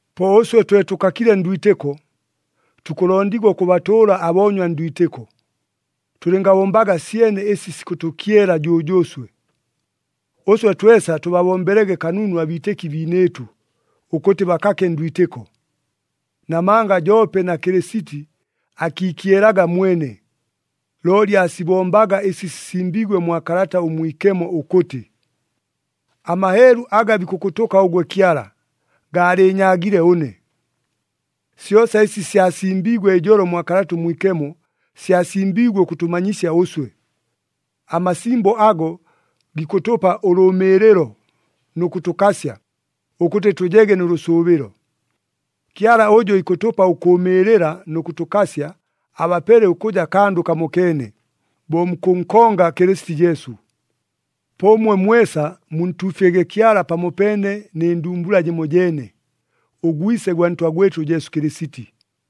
Po ʉswe twe tʉkakile ndwitɨko, tukʉlondigwa ʉkʉbatʉʉla aboonywa ndwitɨko. Tʉlɨngabombaga syene ɨsi sikʉtʉkyela jʉjʉʉswe. Ʉswe twesa tʉbabombelege kanunu abiitɨki biinɨɨtʉ, ʉkʉtɨ bakake ndwitɨko. Namanga joope na Kɨlɨsiti akiikyelaga mwene, looli aasibombaga ɨsi sisimbiigwe mwa Kalata ʉMwikemo ʉkʉtɨ, “Amaheelu aga bikʉkʉtʉka ʉgwe Kyala, gaalɨɨnyaagile ʉne.” Syosa ɨsi syasimbiigwe ijolo mwa Kalata ʉMwikemo, syasimbiigwe ʉkʉtʉmanyisya ʉswe. Amasimbo ago gikʉtʉpa ʉlʉʉmɨɨlɨlo nʉ kʉtʉkasya, ʉkʉtɨ tʉjege nʉ lʉsʉʉbɨlo. Kyala ʉjʉ ikʉtʉpa ʉkʉʉmɨɨlɨla nʉ kʉtʉkasya abapele ʉkʉja kandʉ kamokeene, bo mukʉnkonga Kɨlɨsiti Jesu. Po ʉmwe mwesa muntuufyege Kyala pamopeene nɨ ndumbula jɨmojeene, ʉGwise gwa Ntwa gwɨtʉ Jesu Kɨlɨsiti.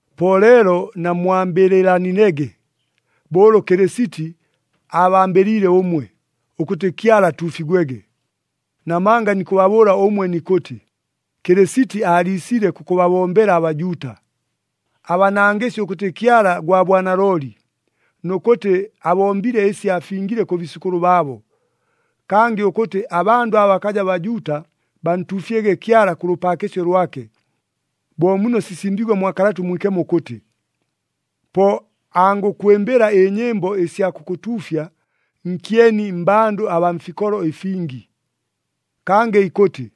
Po leelo namwambɨlɨlanilege bo ʉlʉ Kɨlɨsiti aabambɨliile ʉmwe, ʉkʉtɨ Kyala atuufigwege. Namanga nikʉbabʉʉla ʉmwe nikʉtɨ, Kɨlɨsiti aaliisile kʉkʉbabombela aBajuuta. Aabanangɨsye ʉkʉtɨ Kyala gwa bwanalooli, nʉ kʉtɨ abombile ɨsi aafingile kʉ biisʉkʉlʉ baabo. Kangɨ ʉkʉtɨ abandʉ aba bakaja Bajuuta bantuufyege Kyala kʉ lʉpaakɨsyo lwake, bo muno sisimbiigwe mwa Kalata ʉMwikemo ʉkʉtɨ, “Po angʉkwɨmbɨla ɨnyɨmbo ɨsya kʉkʉtuufya nkyeni mmbandʉ abaa mfikolo ɨfingi.” Kangɨ ikʉtɨ,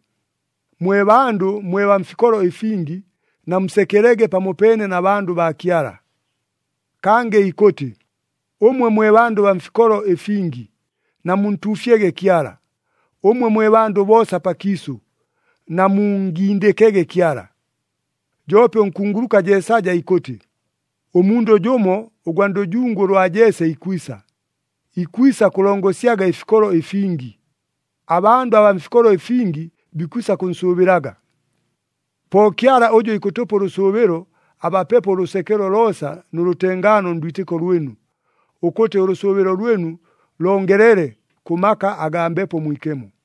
“Mwe bandʉ mwe baa mfikolo ɨfingi, namusekelege pamopeene na bandʉ baa Kyala.” Kangɨ ikʉtɨ, “Ʉmwe mwe bandʉ baa mfikolo ɨfingi, namuntuufyege Kyala. Ʉmwe mwe bandʉ boosa pakiisʉ, namunngindɨkege Kyala!” Joope ʉnkunguluka Jeesaja ikʉtɨ, “Ʉmundʉ jʉmo ʉgwa ndʉjungu ʉlwa Jese ikwisa, ikwisa kʉlongosyaga ɨfikolo ɨfingi, abandʉ abaa mfikolo ɨfingi bikwisa kʉnsʉʉbɨlaga.” Po Kyala ʉjʉ ikʉtʉpa ʉlʉsʉʉbɨlo, abapepo ʉlʉsekelo loosa nʉ lʉtengaano ndwitɨko lwɨnu, ʉkʉtɨ ʉlʉsʉʉbɨlo lwɨnu longelele kʉ maka agaa Mbepo Mwikemo.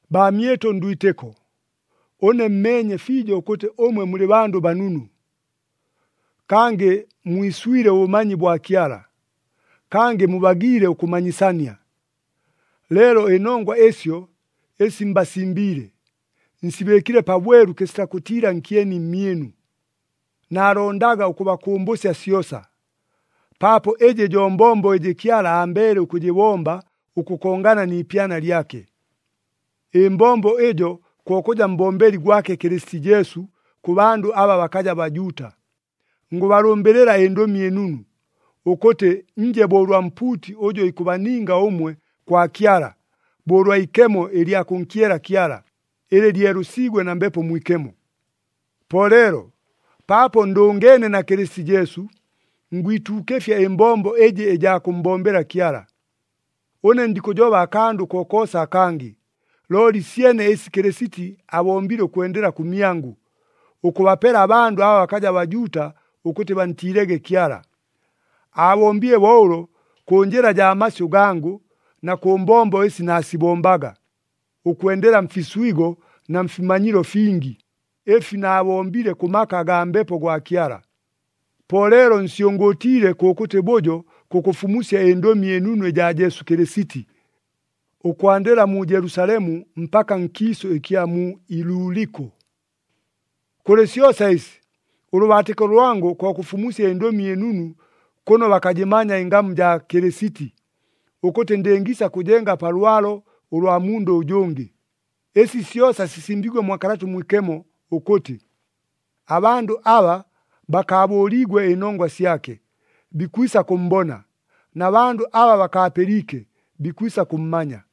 Baamyɨtʉ ndwitɨko, ʉne mmeenye fiijo ʉkʉtɨ ʉmwe mulɨ bandʉ banunu, kangɨ mwiswile ʉbʉmanyi bwa Kyala, kangɨ mubagiile ʉkʉmanyisania. Leelo ɨnongwa ɨsyo ɨsi mbasimbiile, nsibɨɨkile pabwelu kɨsita kʉtiila nkyeni mmyɨnu. Naalondaga ʉkʉbakʉmbʉsya syosa, paapo ɨjɨ jo mbombo ɨjɨ Kyala ambeele ʉkʉjɨbomba ʉkʉkongana ni ipyana lyake. Ɨmbombo ɨjo ko kʉja mbombeli gwake Kɨlɨsiti Jesu kʉ bandʉ aba bakaja Bajuuta. Ngʉbalʉmbɨlɨla ɨNdʉmi ɨNunu, ʉkʉtɨ nje bo ʉlwa mpuuti ʉjʉ ikʉbaninga ʉmwe kwa Kyala, bo ʉlwa ikemo ɨlya kʉnkyela Kyala, ɨlɨ lyelʉsiigwe na Mbepo Mwikemo. Po leelo, paapo ndʉngeene na Kɨlɨsiti Jesu, ngwituukɨfya ɨmbombo ɨjɨ ɨjaa kʉmmbombela Kyala. Ʉne ndikʉjoba akandʉ kokoosa akangɨ, looli syene ɨsi Kɨlɨsiti abombile ʉkwendela kʉmyangʉ, ʉkʉbapela abandʉ aba bakaja Bajuuta ʉkʉtɨ bantiilege Kyala. Aabombile bo ʉlo kʉ njɨla jaa masyʉ gangʉ na kʉ mbombo ɨsi naasibombaga, ʉkwendela mfiswigo na mfimanyilo fingi, ɨfi naabombile kʉ maka agaa Mbepo gwa Kyala. Po leelo nsyʉngʉʉtiile kʉkʉtɨ bʉjo kʉkʉfumusya ɨNdʉmi ɨNunu ɨjaa Jesu Kɨlɨsiti, ʉkwandɨla mu Jelusalemu mpaka nkiisʉ ɨkya mu Iluliko. Kʉlɨ syosa ɨsi, ʉlʉbaatɨko lwangʉ ko kʉfumusya ɨNdʉmi ɨNunu kʉno bakajɨmanya ɨngamu jaa Kɨlɨsiti, ʉkʉtɨ ndɨngiisa kʉjenga pa lwalo ʉlwa mundʉ ʉjʉngɨ. Ɨsi syosa sisimbiigwe mwa Kalata ʉMwikemo ʉkʉtɨ, “Abandʉ aba bakaabʉʉliigwe ɨnongwa syake, bikwisa kʉmmbona, na bandʉ aba bakaapɨliike, bikwisa kʉmmanya.”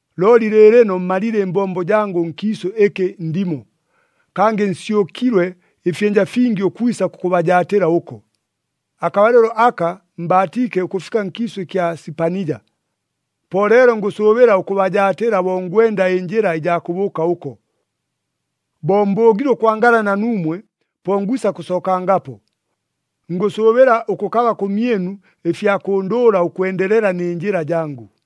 Looli lɨɨlɨno mmalile ɨmbombo jangʉ nkiisʉ ɨkɨ ndimo, kangɨ nsyʉkilwe ɨfyɨnja fingi ʉkwisa kʉkʉbajaatɨla ʉko. Akabalɨlo aka mbaatiike ʉkʉfika nkiisʉ ɨkya Sipanija. Po leelo ngʉsʉʉbɨla ʉkʉbajaatɨla bo ngwenda ɨnjɨla ɨjaa kʉbʉʉka ʉko. Bo mbʉʉgile ʉkwangala na nuumwe, po ngwisa kʉsookangapo. Ngʉsʉʉbɨla ʉkʉkaba kʉmyɨnu ɨfya kʉndʉʉla ʉkwendelela nɨ njɨla jangʉ.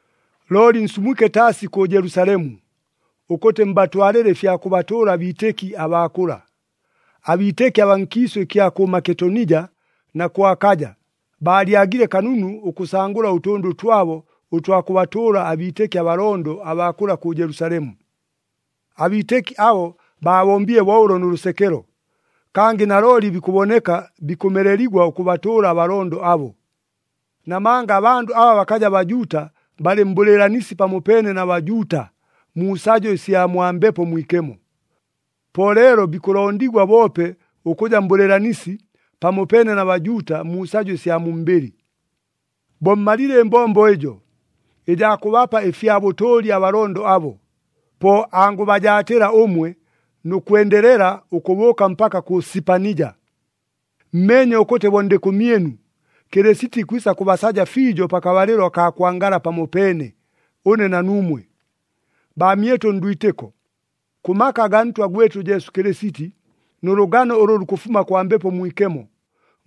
Looli nsumwike taasi kʉ Jelusalemu, ʉkʉtɨ mbatwalɨle ɨfya kʉbatʉʉla abiitɨki abaa kʉla. Abiitɨki abaa nkiisʉ ɨkya kʉ Maketonija na kʉ Akaja, baalyagile kanunu ʉkʉsangʉla ʉtʉndʉ twabo ʉtwa kʉbatʉʉla abiitɨki abalondo abaa kʉla kʉ Jelusalemu. Abiitɨki abo baabombile bo ʉlo nʉ lʉsekelo, kangɨ nalooli bikʉboneka bikʉmeleligwa ʉkʉbatʉʉla abalondo abo. Namanga abandʉ aba bakaja Bajuuta balɨ mbʉlɨɨlanisi pamopeene na Bajuuta mu sajo ɨsya mwa Mbepo Mwikemo. Po leelo bikʉlondigwa boope ʉkʉja mbʉlɨɨlanisi pamopeene na Bajuuta mu sajo ɨsya mu mbɨlɨ. Bo mmalile ɨmbombo ɨjo, ɨjaa kʉbapa ɨfya bʉtʉʉli abalondo abo, po angʉbajaatɨla ʉmwe nʉ kwendelela ʉkʉbʉʉka mpaka kʉ Sipanija. Mmeenye ʉkʉtɨ bo ndɨ kʉmyɨnu, Kɨlɨsiti ikwisa kʉbasaja fiijo pakabalɨlo akaa kwangala pamopeene, ʉne na nuumwe. Baamyɨtʉ ndwitɨko, kʉ maka agaa Ntwa gwɨtʉ Jesu Kɨlɨsiti nʉ lʉgano ʉlʉ lukʉfuma kwa Mbepo Mwikemo,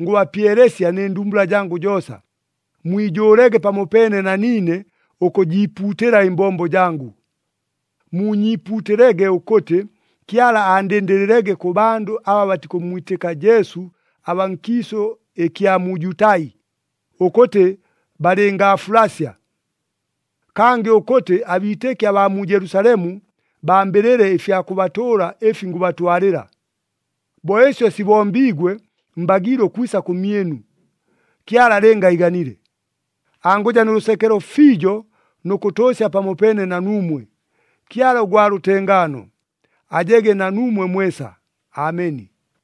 ngʉbapyelesya nɨ ndumbula jangʉ joosa, mwijʉʉlege pamopeene na niine ʉkʉjiipuutɨla ɨmbombo jangʉ. Muunyiipuutɨlege ʉkʉtɨ, Kyala aandɨndɨlɨlege kʉ bandʉ aba batikʉmmwitɨka Jesu abaa nkiisʉ ɨkya mu Jutai, ʉkʉtɨ balɨngaafulasya. Kangɨ ʉkʉtɨ, abiitɨki abaa mu Jelusalemu bambɨlɨle ɨfya kʉbatʉʉla ɨfi ngʉbatwalɨla. Bo ɨsyo sibombiigwe, mbagiile ʉkwisa kʉmyɨnu, Kyala lɨnga iiganile. Angʉja nʉ lʉsekelo fiijo nʉ kʉtʉʉsya pamopeene na nuumwe. Kyala ʉgwa lʉtengaano, ajege na nuumwe mwesa! Ameni.